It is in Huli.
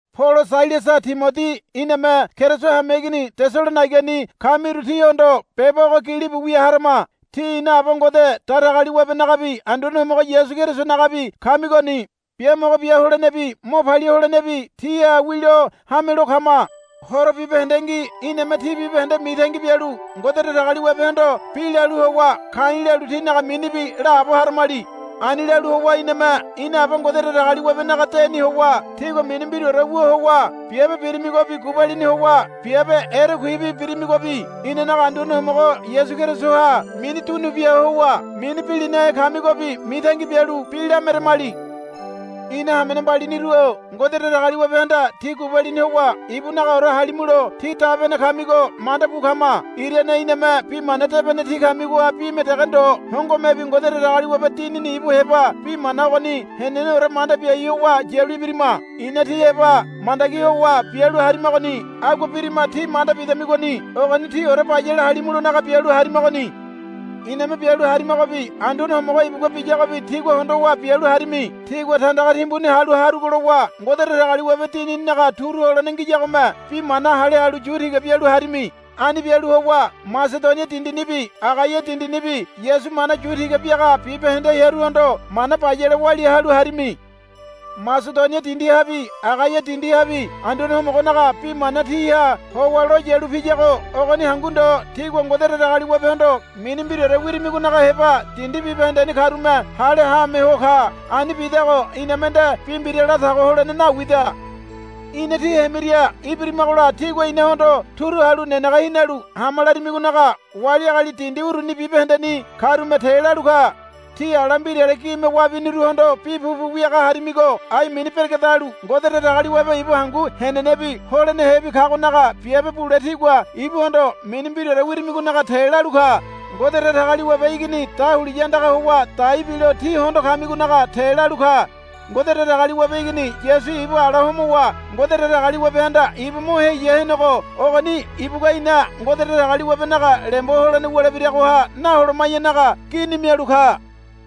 Polo Sailasa Timodi iname Keriso hameigini Tesalonaigani kamiru tíhondo beba ogo gilibu wia harama. Tí ina Aba Ngode Datagaliwabenagabi Anduane Homogo Yasu Kerisonagabi kamigoni. Biamogo bia holenebi mo palia holenebi tíha wilo hamelo kama. Horo bibahendengi iname tí bibahende mitangi bialu Ngode Datagaliwabehondo bi lalu howa ka̱i̱ lalu tínaga minibi laabo haramali. Ani lalu howa iname ina Aba Ngode Datagaliwabe naga deni howa tígua mini mbiraore wu howa biabe birimigobi gubalini howa biabe erekuibi birimigobi inanaga Anduane Homogo Yasu Kerisoha mini dunu bia howa mini bilinahe kamigobi mitangi bialu bi lameremali. Ina hamene mbaliniru-o Ngode Datagaliwabehanda tí gubalini howa ibunagaore halimulo tí dabene kamigo mandabu kama. Irane iname Bi Mana Debene tí kamigoha bime dege ndo hongomebi Ngode Datagaliwabe Dinini ibu heba bi mana ogoni heneneore manda biai howa yalu ibirima. Ina tí heba mandagi howa bialu harimagoni agua birima tí manda bidamigoni. Ogoni tíore bayale halimulonaga bialu harimagoni. Iname bialu harimagobi Anduane Homogo ibugua biyagobi tígua hondowa bialu harimi. Tígua tandaga timbuni halu harugo lowa Ngode Datagaliwabe Dinininaga turu holene ngiyagome bi mana hale halu yu tiga bialu harimi. Ani bialu howa Masedonia dindinibi Agaia dindinibi Yasu mana yu tiga biaga bibahende hearuhondo mana bayale walia halu harimi. Masedonia dindihabi Agaia dindihabi Anduane Homogonaga bi mana tíha howa lo yalu piyago ogoni hangu ndo tígua Ngode Datagaliwabehondo mini mbiraore wirimigonaga heba dindi bibahendeni karume hale haame ho ka. Ani bidago iname nde bi mbira latago holene nawida. Ina tí hemiria ibirimagola tígua inahondo turu halu nenege hinalu, Hama, larimigonaga wali agali dindi uruni bibahendeni karume te lalu ka. Tí ala mbirale gime wabiniruhondo bi pupu wiaga harimigo ai mini beregedalu Ngode Datagaliwabe ibu hangu henenebi holenehebi kagonaga biabe bule tígua ibuhondo mini mbiraore wirimigonaga te lalu ka. Ngode Datagaliwabe Igini dahuliya andaga howa dai bilo tí hondo kamigonaga te lalu ka. Ngode Datagaliwabe Igini Yasu ibu ala homowa Ngode Datagaliwabe handa ibu mo heya henego ogoni ibugua ina Ngode Datagaliwabe naga lembo holene wulebiragoha naholoma̱yanaga gini mialu ka.